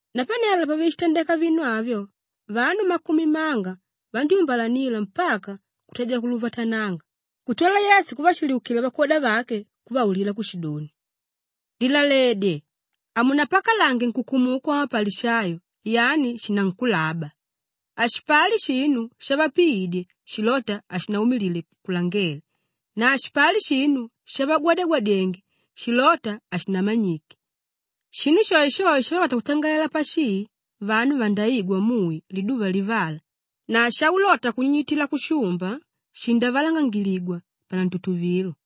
Napanelo pavishitandeka vinu avyo, vanu makumi manga vandyúmbalanila mpaka kutadya kuluvatananga kutwala Yesu kuvashiliukila vakwoda vake kuvaulila kushidoni, “Lilaledye! Hamunapakalange nkukumuku wamapalishayo yani shinankulaba. Hashipali shinu shavapiidye shilóta hashinaumilile kulangele na hashipali shinu shavagwadyagwadyenge shilóta hashinamanyike. Shinu shoeshoe shaulota kutangalela pashii vanu vandaigwa mui liduva livala na shaulota kunyinyitila kushumba shindavalangangigwa panantutuvilo.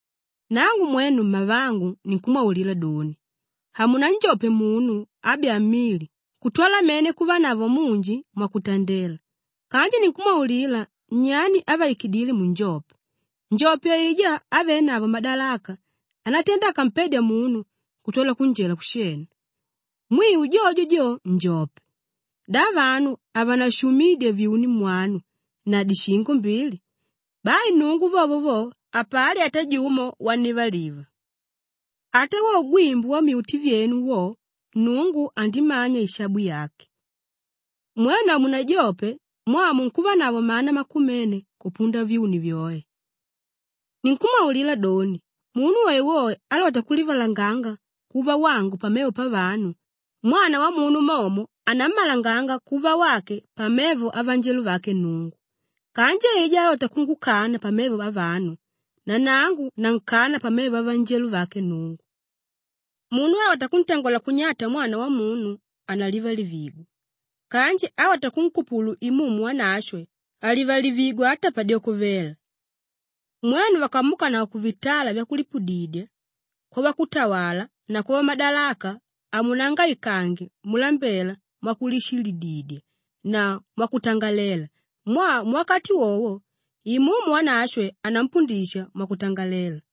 “Nangu mwenu mmavangu ninkumwaulila doni, hamunanjope munu ábyaa mili kutwala mene kuvanavo munji mwakuntandela kanji ninkumwaulila nyani ávaikidile munjope; njope aijá ávenavo madalaka ánatenda akampedya munu kuntwala kunjela kushena. Mwiu jojo jo, njope! Da vanu havanashumidya vyuni mwanu na dishingo mbili? Bai Nnungu vovo vo, hapali ata jumo wannivaliva. Ata wo ugwimbu wammyuti vyenu wo, Nnungu andimanya ishabu yake. Mwenu hamunajope mwaa munkuvanavo mana makumene kupunda vyuni vyoe! “Ninkumwaulila doni, munu woewoe álota kulivalanganga kuva wangu pamevo pavanu, Mwana Wamunu momo anammalanga kuva wake pamevo avanjelo vake Nnungu. Kanji aijá álota kungukana pamevo avanu, nanangu nankana pamevo avanjelo vake Nnungu. Munu álota kuntangola kunyata Mwana Wamunu, analivalivigwa; kanji álota kunkupulu Imumu Wanashwe, halivalivigwa ata padyoko vela. Mwenu vakamuukanavo kuvitala vyakulipudidya, kwavakutawala na kwavamadalaka, hamunangaikange mulambela mwakulishililididya na mwakutangalela mwaa muwakati wowo, Imumu Wanashwe anampundisha mwakutangalela.”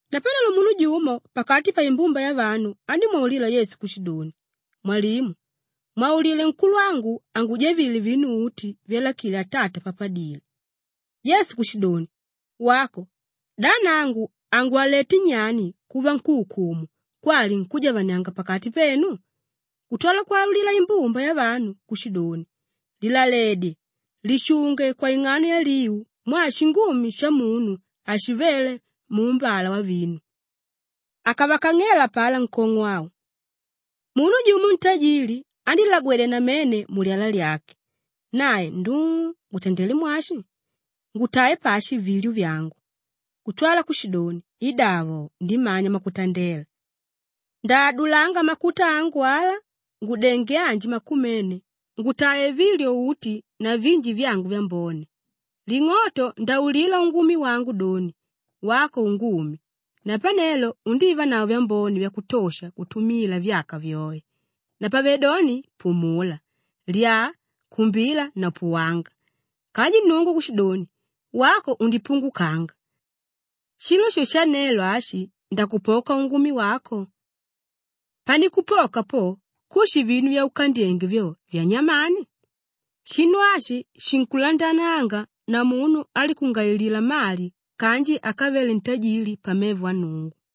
Napanelo munu jumo pakati paimbumba yavanu andímwaulila Yesu kushidoni, “Mwalimu, mwaulile nkulwangu angujavile vinu uti vyalakile atata papadile.” Yesu kushidoni, “Wako! Da nangu angwalweté nyani kuva nkúukumu kwali nkújavanianga pakati penu?” Kutwala kwaulila imbumba yavanu kushidoni, “Lilaledye! Lishunge kwaing'ano yaliu mwaa shingumi shamunu hashivele muumbala wavinu.” Akavakang'ela apalá nkong'o au, “Munu jumo ntajili andílagwedya namene mulyala lyake. Nae, ‘Nduu, ngutandelé mwashi? Ngutae pashi vilyo vyangu?’ Kutwala kushidoni, ‘Idavo, ndimanya mwakutandela. Ndaadulanga makuta angu ala, ngudenge anji makumene ngutae vilyo uti na vinji vyangu vyambone. Ling'oto ndaulila ungumi wangu doni, “Wako Ungumi! Napanelo undivanavo vyambone vyakutosha kutumila vyaka vyoe. Napavedoni pumula, lyaa, kumbila na puwanga.” ’ Kanji Nnungu kushidoni, ‘Wako undipungukanga! Shilo sho shanelo ashi ndakupoka ungumi wako! Panikupoka po, kushi vinu vyaukandyenge vyo, vyanyamani?’ Shinu ashi shinkulandananga na munu álikungailila mali kanji akavele ntajili pamevo a Nnungu.”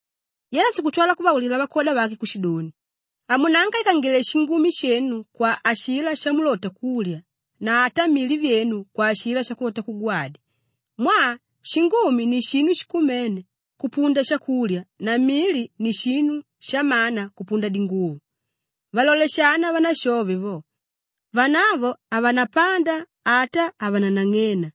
Yesu kutwala kuvaulila vakwoda vake kushidoni, “Hamunaangaikangile shingumi shenu kwa ashilá shamulota kulya na ata mili vyenu kwa ashilá shakulota kugwadya. Mwaa shingumi ni shinu shikumene kupunda shakulya na mili ni shinu shamana kupunda dinguvo. Valole shana vanashove vo; vanavo havanapanda ata havananang'ena,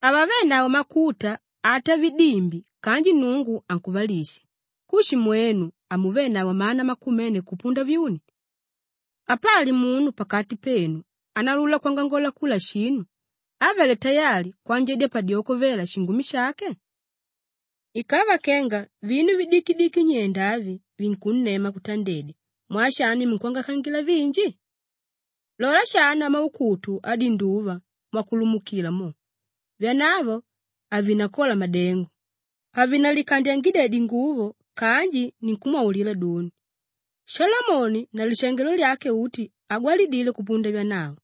havavenavo makuta ata vidimbi kanji Nnungu ankuvalisha. Kushi mwenu, hamuvenavo mana makumene kupunda vyuni? Apali munu pakati penu ánaulula kwangangola kula shinu, ávele tayali kwanjadyedya padyoko vela shingumi shake? Ikava kenga vinu vidikidiki nyenda avi vinkunnema kutandedya, mwaa shani munkwangaikangila vinji? Lola shana maukutu adinduva mwakulumukila mo; vyanavo havinakola madengo, havinalikandyangidya dinguvo kanji ninkumwaulila doni, Shalomoni na lishangelo lyake uti hagwalidile kupunda vyanavo.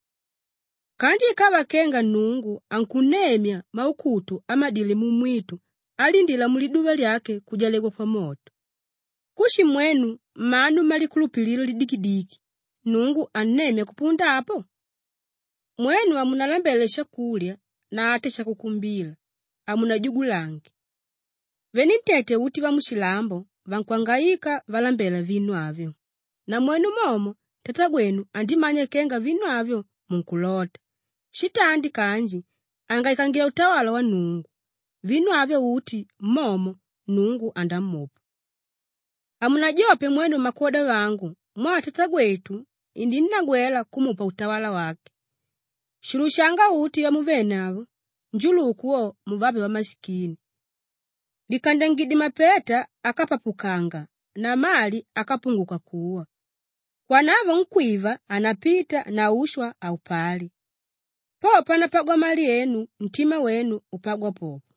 Kanji ikava kenga Nnungu ankunemya maukutu amadíle mumwitu alindíla muliduva lyake kujalegwa pamoto; kushi mwenu, mmanu mmalikulupililo lidikidiki, Nnungu annemya kupunda apo? Mwenu hamunalambele shakulya na ata shakukumbila. Hamunajugulange. Venentete uti vamushilambo vankwangaika valambela vinu avyo namwenu momo Tatagwenu andimanya kenga vinu avyo, munkulota. Shitandi kanji angaikangila utawala wa Nnungu; vinu avyo uti momo Nnungu andamupa. “Hamunajope mwenu mmakwoda vangu mwaa Tatagwetu ininnagwela kumupa utawala wake. Shulushanga uti vyamuvenavo njuluku wo, muvape vamashikini! Likandyangidye mapeta ákapapukanga na mali ákapunguka kuwa; kwanavo nkwíva hanapita na ushwa haupali. Po panapagwa mali enu, ntima wenu upagwa popo.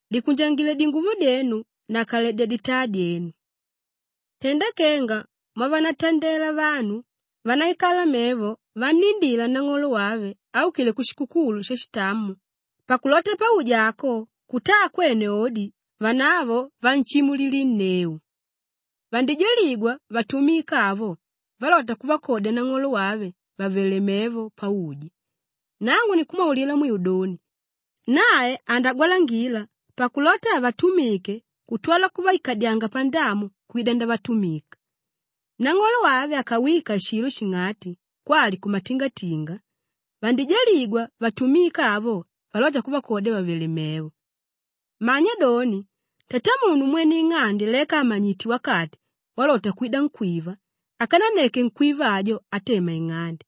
“Likunjangile dinguvo dyenu na kaledya ditaa dyenu. Tenda kenga mwavanatandela vanu vánaikala mevo vannindila nang'olo wave áukile kushikukulu shashitamo pakulota pauja ako kutaa kwene odi, vanavo vanshimulilinneu. Vandijaligwa vatumika avo valóta kuvakodya nang'olo wave vàvele mevo pauja. Nangu ninkumwaulila mwiu doni, nae andagwalangila pakulota avatumike kutwala kuvaikadyanga pandamu kwida ndavatumika. Nang'olo wave akawika shilo shing'ati kwali kumatingatinga, vandijaligwa vatumika avo valota kuvakodya vàvele mevo! Manya doni, tatamunu mwene ing'ande leka àmanyite wakati walota kwida nkwíva, akananneke nkwíva ajo atema ing'ande.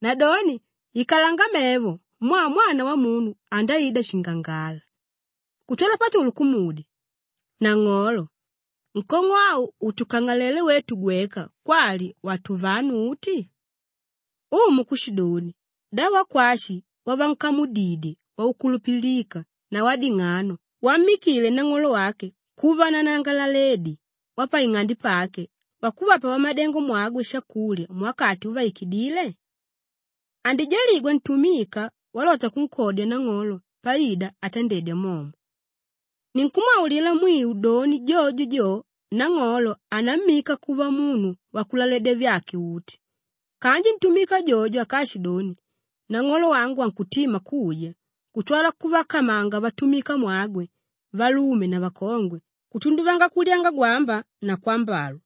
Nadoni ikalanga mevo mwaa Mwana Wamunu andaida shingangala.” Kutwala Patulu kumudya, “Nang'olo, nkong'o au utukang'alele wetu gweka kwali watuvanu uti?” Umu kushidoni, “Da wakwashi wavankamudidye wakukulupilika na wading'ano wammikile nang'olo wake kuva nanangalaledi wapaing'ande pake wakuvapa vamadengomwagwe shakulya muwakati uvaikidíle? Andijaligwa ntumika walota kunkodya nang'olo paida atandedya momo. Ninkumwaulila mwiu doni jojo jo, nang'olo anammika kuva munu wakulaledya vyake uti. Kanji ntumika jojo akaashidoni, ‘Nang'olo wangu ankutima kuja,’ kutwala kuvakamanga vatumikamwagwe valume na vakongwe, kutunduvanga kulyanga gwamba na kwambalwa,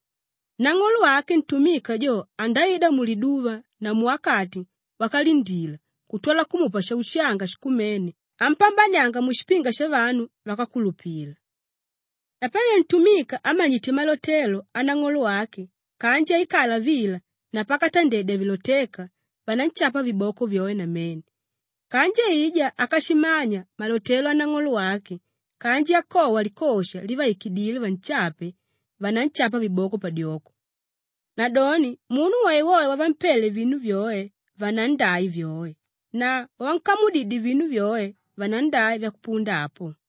nang'olo wake ntumika jo andaida muliduva na muwakati wakalindila kutwala kumupa shaushanga shikumene ampambanianga mushipinga shavanu vákakulupila. Kwali: vákakulupilika. “Napanelo ntumika ámanyite malotelo anang'olo wake kanji aikala vila na pakatandedya vilotéka, vananshapa viboko vyoe namene. Kanji aijá ákashimanya malotelo anang'olo wake kanji akowa likosha livaikidíle vanshape, vananshapa viboko padyoko. Nadoni munu woewoe wavampele vinu vyoe, vanandai vyoe na wavankamudidye vinu vyoe, vanandai vyakupunda apo.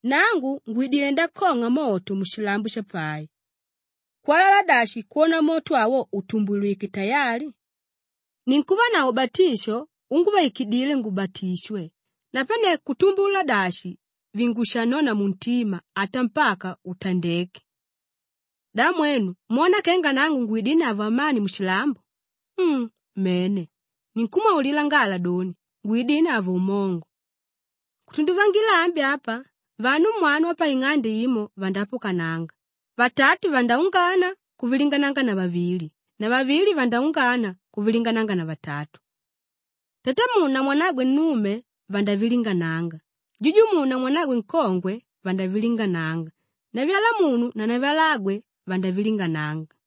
“Nangu ngwidilé ndakong'a moto mushilambo shapai. Kwalala dashi kwona moto awo utumbulwike tayali! Ninkuvanavo ubatisho unguvaikidíle ngubatishwe, napane kutumbula dashi vingushanona muntima ata mpaka utandeke. Da mwenu mwona kenga nangu ngwidinavo amani mushilambo? Um! Mene, ninkumwaulila ngala doni, ngwidinavo umongo. Kutunduvangila ambi apa, vanu mwanu vapaing'ande imo vandaapukananga, vatatu vandaungana kuvilingananganavo vavili na vavili vandaungana kuvilingananganavo vatatu. Tatamunu na mwanagwe nnume vandavilingananga, jujumunu na mwanagwe nkongwe vandavilingananga, navyalamunu na navyalagwe vandavilingananga.”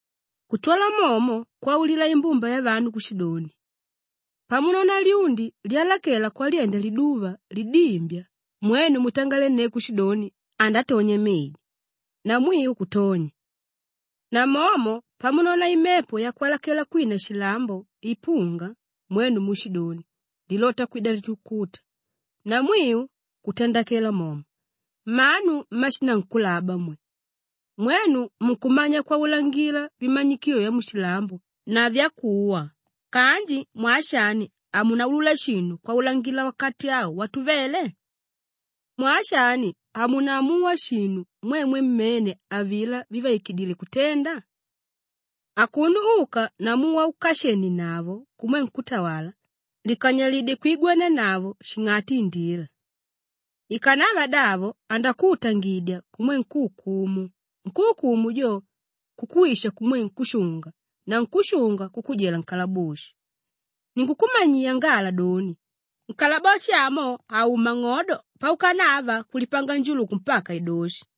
Kutwala momo kwaulila imbumba yavanu kushidoni, “Pamunona lyundi lyalakela kwalyenda liduva lidimbya mwenu mutangalenneu kushidoni ‘Andatonya medi,’ namwiu kutonya. Namomo pamunona imepo yakwalakela kwina shilambo ipunga mwenu muushidoni, ‘lilota kwida litukuta,’ namwiu kutandakela momo. Mmanu mmashinankulaba mwe! Mwenu munkumanya kwaulangila vimanyikilo vyamushilambo na vyakuwa kanji mwaa shani hamunaulula shinu kwaulangila wakati au watuvele? “Mwaa shani hamunaamuwa shinu mwemwe mmene avilá vivaikidíle kutenda? Akuno uka namu waukashenienavo kumwe nkútawala, likanyalidye kwigwanianavo shing'ati indila. Ikanava davo andakuutangidya kumwe nkúukumu, nkúukumu jo kukuwisha kumwe nkúshunga na nkúshunga kukujela nkalaboshi. Ninkukumanyiya ngala doni, nkalaboshi amo hauma ng'odo paukanava kulipanga njuluku mpaka idoshi.”